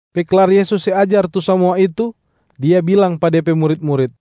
Pe klar Yesus se ajar tu samua itu, Dia bilang pa De pe murit-murit,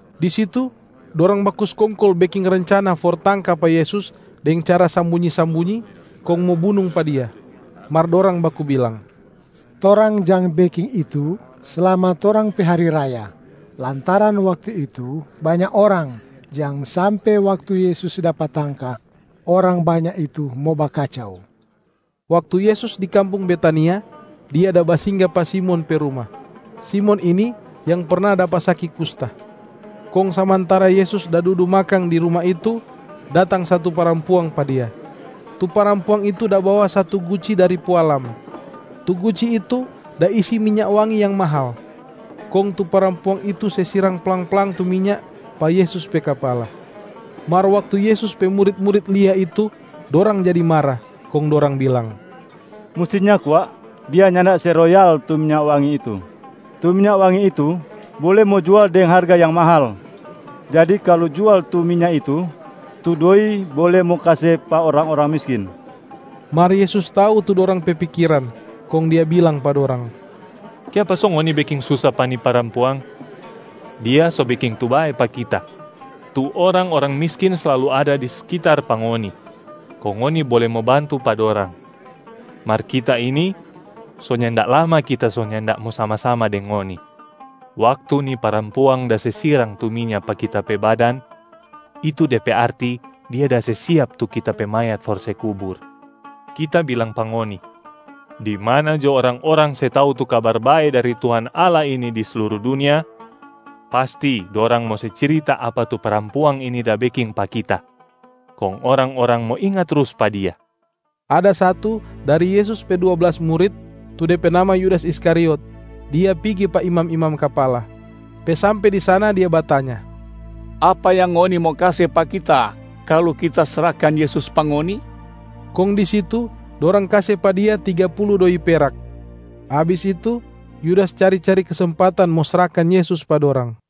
Di situ dorang baku skongkol beking rencana for tangka pa Yesus deng cara sambunyi-sambunyi kong mo bunung pa Dia. Mar dorang baku bilang, “Torang jang beking itu slama torang pe hari raya, lantaran waktu itu banya orang, jang sampe waktu Yesus dapa tangka orang banya itu mo bakacau.” Waktu Yesus di kampung Betania, Dia da basingga pa Simon pe ruma. Simon ini yang perna dapa saki kusta. Kong samantara Yesus da dudu makang di ruma itu, datang satu parampuang pa Dia. Tu parampuang itu da bawa satu guci dari pualam. Tu guci itu da isi minya wangi yang mahal. Kong tu parampuang itu se sirang plang-plang tu minya pa Yesus pe kapala. Mar waktu Yesus pe murit-murit lia itu, dorang jadi mara, kong dorang bilang, “Mustinya kwa dia nyanda se royal tu minya wangi itu. Tu minya wangi itu bole mo jual deng harga yang mahal! Jadi kalu jual tu minya itu, tu doi bole mo kase pa orang-orang miskin.” Mar Yesus tau tu dorang pe pikiran, kong Dia bilang pa dorang, “Kiapa so ngoni beking susa pa ni parampuang? Dia so beking tu bae pa Kita. Tu orang-orang miskin slalu ada di sekitar pa ngoni kong ngoni bole mo bantu pa dorang. Mar Kita ini, so nyanda lama Kita so nyanda mo sama-sama deng ngoni. Waktu ni parampuang da se sirang tu minya pa Kita pe badan, itu de pe arti dia da se siap tu Kita pe mayat for se kubur. Kita bilang pa ngoni, di mana jo orang-orang se tau tu Kabar Bae dari Tuhan Allah ini di sluru dunia, pasti dorang mo se cirita apa tu parampuang ini da beking pa Kita kong orang-orang mo inga trus pa dia.” Ada satu dari Yesus pe dua blas murit, tu de pe nama Yudas Iskariot, dia pigi pa imam-imam kapala. Pe sampe di sana dia batanya, “Apa yang ngoni mo kase pa kita kalu kita srahkan Yesus pa ngoni?” Kong di situ dorang kase pa dia tiga pulu doi peraka. Abis itu Yudas cari-cari kesempatan mo srahkan Yesus pa dorang.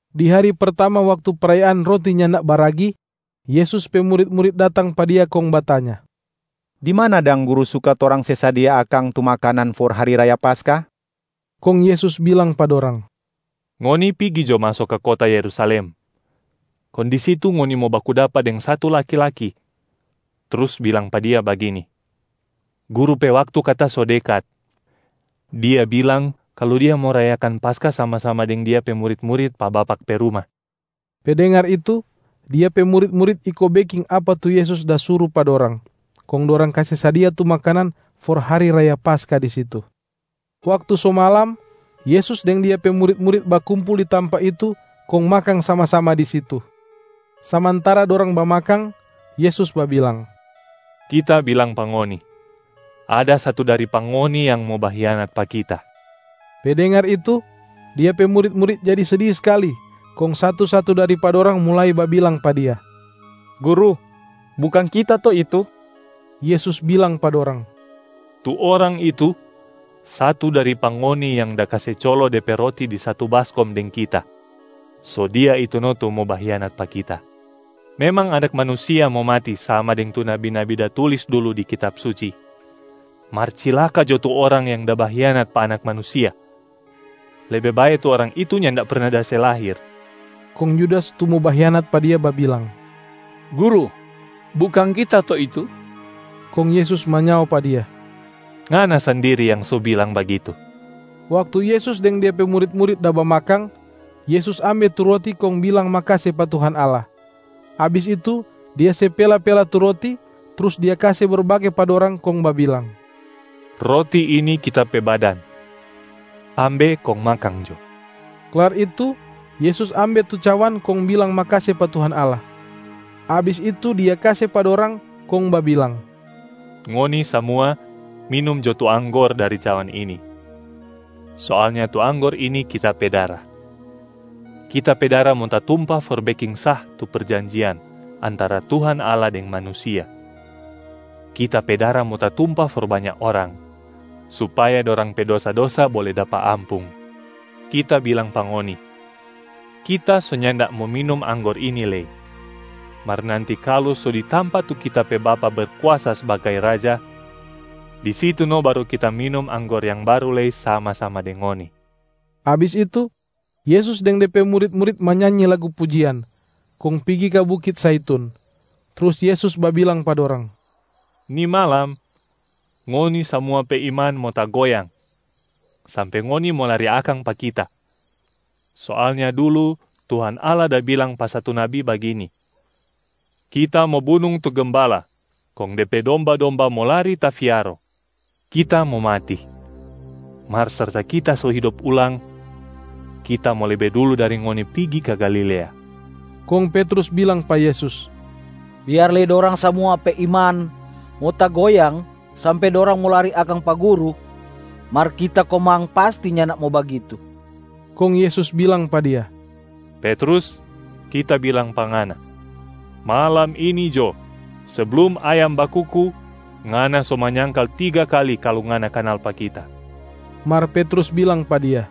Di hari pertama waktu prayaan Roti Nyanda Baragi, Yesus pe murit-murit datang pa Dia kong batanya, “Di mana dang Guru suka torang se sadia akang tu makanan for hari raya Paskah?” Kong Yesus bilang pa dorang, “Ngoni pigi jo maso ka kota Yerusalem, kong di situ ngoni mo baku dapa deng satu laki-laki, trus bilang pa dia bagini, ‘Guru pe waktu kata so dekat. Dia bilang kalu Dia mo rayakan Paskah sama-sama deng Dia pe murit-murit pa bapak pe ruma.’” Pe dengar itu, Dia pe murit-murit iko beking apa tu Yesus da suru pa dorang, kong dorang kase sadia tu makanan for hari raya Paskah di situ. Waktu so malam, Yesus deng Dia pe murit-murit bakumpul di tampa itu kong makang sama-sama di situ. Samantara dorang bamakang, Yesus babilang, “Kita bilang pa ngoni, ada satu dari pa ngoni yang mo bahianat pa Kita.” Pe dengar itu, Dia pe murit-murit jadi sedi skali, kong satu-satu dari pa dorang mulai babilang pa Dia, “Guru, bukang kita to itu?” Yesus bilang pa dorang, “Tu orang itu, satu dari pa ngoni yang da kase colo de pe roti di satu baskom deng Kita, so dia itu no tu mo bahianat pa Kita. Memang Anak Manusia mo mati sama deng tu nabi-nabi da tulis dulu di Kitab Suci, mar cilaka jo tu orang yang da bahianat pa Anak Manusia. Lebe bae tu orang itu nyanda perna da se lahir.” Kong Yudas tu mo bahianat pa Dia babilang, “Guru, bukang kita to itu?” Kong Yesus manyao pa dia, “Ngana sandiri yang so bilang bagitu!” Waktu Yesus deng De pe murit-murit da bamakang, Yesus ambe tu roti kong bilang makase pa Tuhan Allah. Abis itu Dia se pela-pela tu roti, trus Dia kase berbage pa dorang kong babilang, “Roti ini Kita pe badan, ambe kong makang jo.” Klar itu Yesus ambe tu cawan kong bilang makase pa Tuhan Allah. Abis itu Dia kase pa dorang, kong babilang, “Ngoni samua minum jo tu anggor dari cawan ini! Soalnya tu anggor ini Kita pe dara. Kita pe dara mo tatumpa for beking sah tu perjanjian antara Tuhan Allah deng manusia. Kita pe dara mo tatumpa for banya orang, supaya dorang pe dosa-dosa bole dapa ampung. Kita bilang pa ngoni, Kita so nyanda mo minum anggor ini lei, mar nanti kalu so di tampa tu Kita pe Bapa Berkuasa sbagai Raja, di situ no baru Kita minum anggor yang baru lei sama-sama deng ngoni.” Abis itu, Yesus deng De pe murit-murit manyanyi lagu pujian, kong pigi ka bukit Zaitun. Trus Yesus babilang pa dorang, “Ni malam, ngoni samua pe iman mo tagoyang sampe ngoni mo lari akang pa Kita. Soalnya dulu Tuhan Allah da bilang pa satu nabi bagini, ‘Kita mo bunung tu gembala, kong de pe domba-domba mo lari tafiaro.’ Kita mo mati, mar serta Kita so hidop ulang, Kita mo lebe dulu dari ngoni pigi ka Galilea.” Kong Petrus bilang pa Yesus, “Biar lei dorang samua pe iman mo tagoyang sampe dorang mo lari akang pa Guru, mar kita komang pasti nyanda mo bagitu.” Kong Yesus bilang pa dia, “Petrus, Kita bilang pa ngana. Malam ini jo, seblum ayam bakuku, ngana so manyangkal tiga kali kalu ngana kanal pa Kita.” Mar Petrus bilang pa Dia,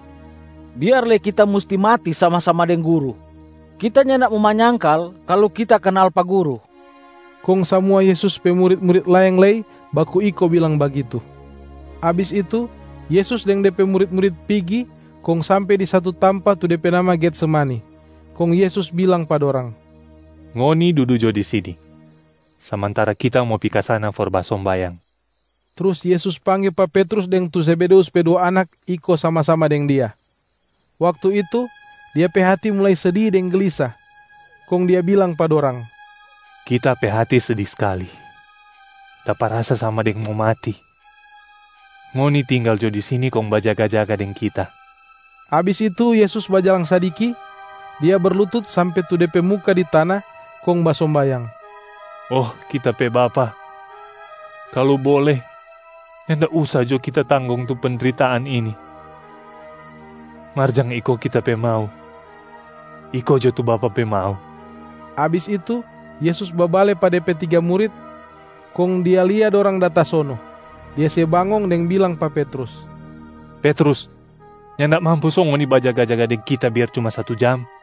“Biar lei kita musti mati sama-sama deng Guru, kita nyanda mo manyangkal kalu kita kanal pa Guru.” Kong samua Yesus pe murit-murit laeng lei baku iko bilang bagitu. Abis itu, Yesus deng De pe murit-murit pigi kong sampe di satu tampa tu de pe nama Getsemani. Kong Yesus bilang pa dorang, “Ngoni dudu jo di sini, samantara Kita mo pi ka sana for basombayang.” Trus Yesus pangge pa Petrus deng tu Zebedeus pe dua anak iko sama-sama deng Dia. Waktu itu, Dia pe hati mulai sedi deng gelisa. Kong Dia bilang pa dorang, “Kita pe hati sedi skali, dapa rasa sama deng mo mati. Ngoni tinggal jo di sini kong bajaga-jaga deng Kita.” Abis itu Yesus bajalang sadiki, Dia berlutut sampe tu De pe muka di tana kong basombayang, “Oh Kita pe Bapa, kalu bole, nyanda usa jo Kita tanggong tu pendritaan ini. Mar jang iko Kita pe mau, iko jo tu Bapa pe mau.” Abis itu Yesus babale pa De pe tiga murit, kong Dia lia dorang da tasono. Dia se bangong deng bilang pa Petrus, “Petrus, nyanda mampu so ngoni bajaga-jaga deng Kita biar cuma satu jam?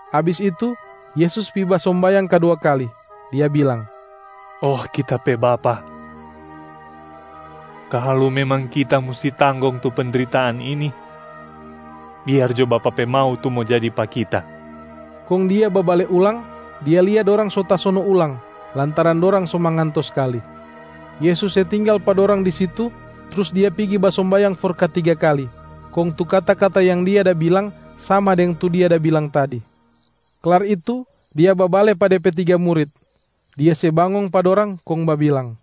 Abis itu Yesus pi basombayang kadua kali, Dia bilang, “Oh Kita pe Bapa, kalu memang Kita musti tanggong tu pendritaan ini, biar jo Bapa pe mau tu mo jadi pa Kita.” Kong Dia babale ulang, Dia lia dorang so tasono ulang, lantaran dorang so manganto skali. Yesus se tinggal pa dorang di situ trus Dia pigi basombayang for katiga kali, kong tu kata-kata yang Dia da bilang sama deng tu Dia da bilang tadi. Klar itu Dia babale pa De pe tiga murit. Dia se bangong pa dorang kong babilang,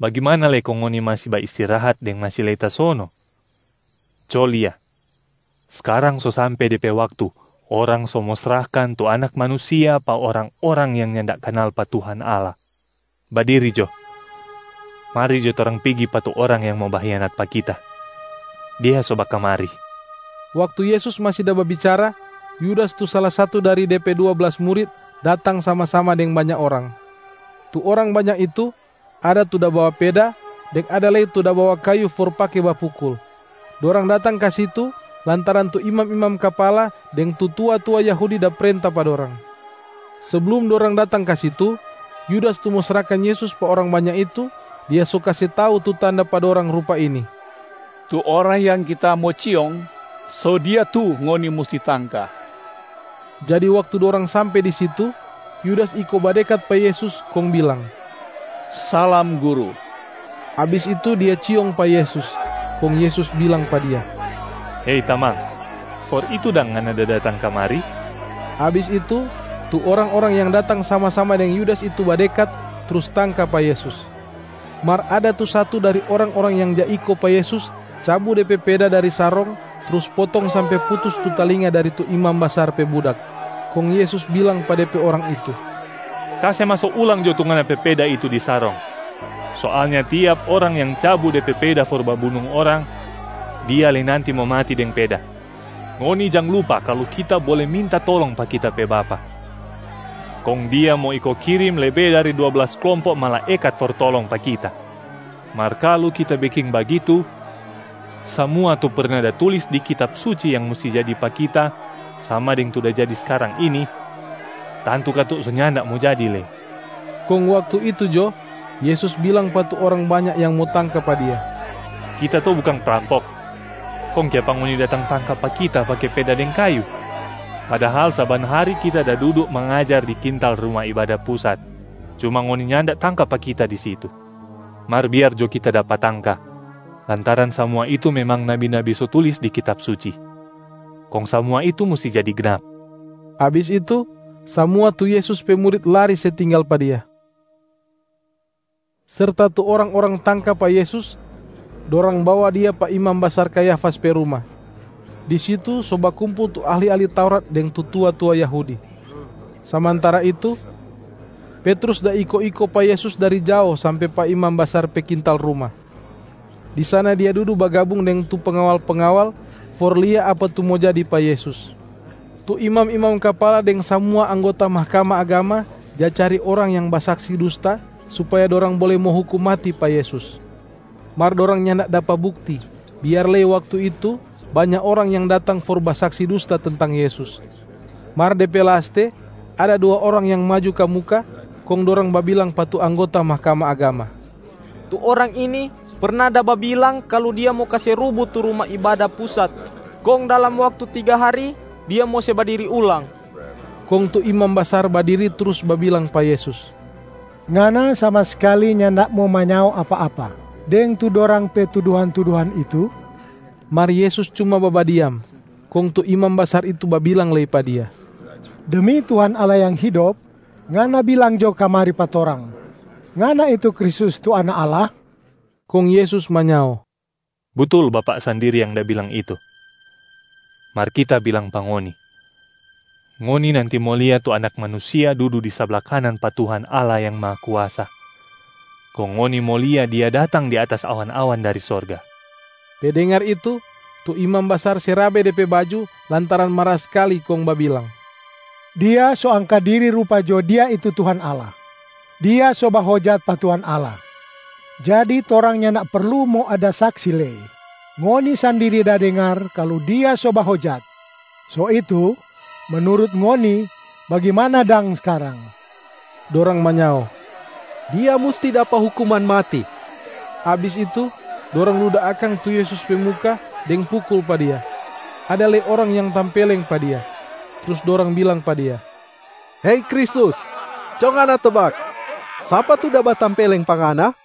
“Bagimana lei kong ngoni masi baistirahat deng masi lei tasono? Co lia, skarang so sampe de pe waktu orang so mo srahkan tu Anak Manusia pa orang-orang yang nyanda kanal pa Tuhan Allah. Badiri jo! Mari jo torang pigi pa tu orang yang mo bahianat pa Kita, dia so bakamari.” Waktu Yesus masi da babicara, Yudas tu sala satu dari De pe dua blas murit datang sama-sama deng banya orang. Tu orang banya itu, ada tu da bawa peda deng ada lei tu da bawa kayu for pake bapukul. Dorang datang ka situ lantaran tu imam-imam kapala deng tu tua-tua Yahudi da prenta pa dorang. Seblum dorang datang ka situ, Yudas tu mo srahkan Yesus pa orang banya itu, dia so kase tau tu tanda pa dorang rupa ini, “Tu orang yang kita mo ciong, so Dia tu ngoni musti tangka.” Jadi waktu dorang sampe di situ, Yudas iko badekat pa Yesus kong bilang, “Salam Guru!” Abis itu dia ciong pa Yesus. Kong Yesus bilang pa dia, “Hei tamang, for itu dang ngana da datang kamari?” Abis itu tu orang-orang yang datang sama-sama deng Yudas itu badekat trus tangka pa Yesus. Mar ada tu satu dari orang-orang yang ja iko pa Yesus cabu de pe peda dari sarong trus potong sampe putus tu talinga dari tu imam basar pe budak. Kong Yesus bilang pa De pe orang itu, “Kase maso ulang jo tu ngana pe peda itu di sarong! Soalnya tiap orang yang cabu de pe peda for babunung orang, dia lei nanti mo mati deng peda. Ngoni jang lupa kalu Kita bole minta tolong pa Kita pe Bapa, kong Dia mo iko kirim lebe dari dua blas klompob malaekat for tolong pa Kita. Mar kalu Kita beking bagitu, samua tu perna da tulis di Kitab Suci yang musti jadi pa Kita sama deng tu da jadi skarang ini, tantu katu so nyanda mo jadi lei.” Kong waktu itu jo, Yesus bilang pa tu orang banya yang mo tangka pa Dia, “Kita to bukang prampok, kong kiapa ngoni datang tangka pa Kita pake peda deng kayu? Padahal saban hari Kita da dudu mangajar di kintal Ruma Ibada Pusat, cuma ngoni nyanda tangka pa Kita di situ. Mar biar jo Kita dapa tangka lantaran samua itu memang nabi-nabi so tulis di Kitab Suci, kong samua itu musti jadi gnap.” Abis itu, samua tu Yesus pe murit lari se tinggal pa Dia. Serta tu orang-orang tangka pa Yesus, dorang bawa Dia pa imam basar Kayafas pe ruma. Di situ so bakumpul tu ahli-ahli Taurat deng tu tua-tua Yahudi. Samantara itu, Petrus da iko-iko pa Yesus dari jao sampe pa imam basar pe kintal ruma. Di sana dia dudu bagabung deng tu pengawal-pengawal for lia apa tu mo jadi pa Yesus. Tu imam-imam kapala deng samua anggota Mahkamah Agama ja cari orang yang basaksi dusta supaya dorang bole mo hukum mati pa Yesus. Mar dorang nyanda dapa bukti, biar lei waktu itu banya orang yang datang for basaksi dusta tentang Yesus. Mar de pe laste ada dua orang yang maju ka muka, kong dorang babilang pa tu anggota Mahkamah Agama, “Tu Orang ini perna da babilang kalu Dia mo kase rubu tu Ruma Ibada Pusat kong dalam waktu tiga hari Dia mo se badiri ulang.” Kong tu imam basar badiri trus babilang pa Yesus, “Ngana sama skali nyanda mo manyao apa-apa deng tu dorang pe tuduhan-tuduhan itu?” Mar Yesus cuma babadiam. Kong tu imam basar itu babilang lei pa Dia, “Demi Tuhan Allah yang hidop, Ngana bilang jo kamari pa torang, Ngana itu Kristusc tu Anak Allah?” Kong Yesus manyao, “Butul, bapak sandiri yang da bilang itu. Mar Kita bilang pa ngoni, ngoni nanti mo lia tu Anak Manusia dudu di sabla kanan pa Tuhan Allah yang Mahakuasa, kong ngoni mo lia Dia datang di atas awan-awan dari sorga.” Pe dengar itu, tu imam basar se rabe de pe baju lantaran mara skali kong babilang, “Dia so angka diri rupa jo Dia itu Tuhan Allah, Dia so bahojat pa Tuhan Allah. Jadi torang nyanda perlu mo ada saksi lei. Ngoni sandiri da dengar kalu Dia so bahojat. So itu, menurut ngoni bagimana dang skarang?” Dorang manyao, “Dia musti dapa hukuman mati.” Abis itu, dorang luda akang tu Yesus pe muka deng pukul pa Dia. Ada lei orang yang tampeleng pa Dia. Trus dorang bilang pa Dia, “Hei Kristus, co Ngana tebak, sapa tu da batampeleng pa Ngana?”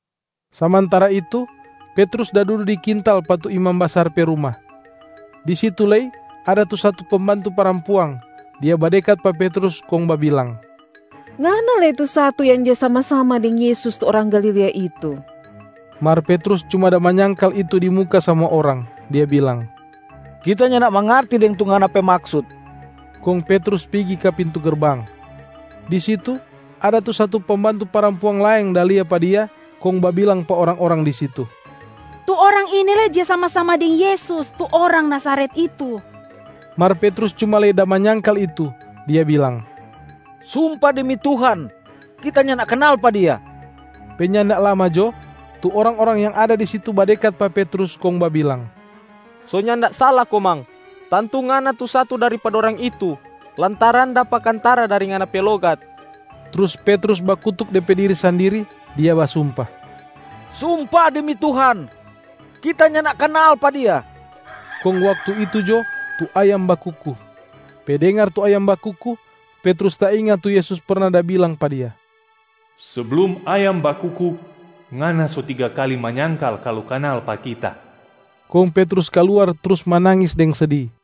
Samantara itu, Petrus da dudu di kintal pa tu imam basar pe ruma. Di situ lei ada tu satu pembantu parampuang, dia badekat pa Petrus kong babilang, “Ngana lei tu satu yang ja sama-sama deng Yesus tu orang Galilea itu.” Mar Petrus cuma da manyangkal itu di muka samua orang, dia bilang, “Kita nyanda mangarti deng tu ngana pe maksut.” Kong Petrus pigi ka pintu gerbang. Di situ ada tu satu pembantu parampuang laeng da lia pa dia kong babilang pa orang-orang di situ, “Tu orang ini lei ja sama-sama deng Yesus, tu Orang Nazaret itu.” Mar Petrus cuma lei da manyangkal itu, dia bilang, “Sumpa demi Tuhan, kita nyanda kanal pa Dia.” Pe nyanda lama jo, tu orang-orang yang ada di situ badekat pa Petrus kong babilang, “So nyanda sala komang, tantu ngana tu satu dari pa dorang itu lantaran dapa kantara dari ngana pe logat.” Trus Petrus bakutuk de pe diri sandiri, dia basumpa, “Sumpa demi Tuhan, kita nyanda kanal pa Dia!” Kong waktu itu jo tu ayam bakuku. Pe dengar tu ayam bakuku, Petrus tainga tu Yesus perna da bilang pa dia, “Seblum ayam bakuku, ngana so tiga kali manyangkal kalu kanal pa Kita.” Kong Petrus kaluar trus manangis deng sedi.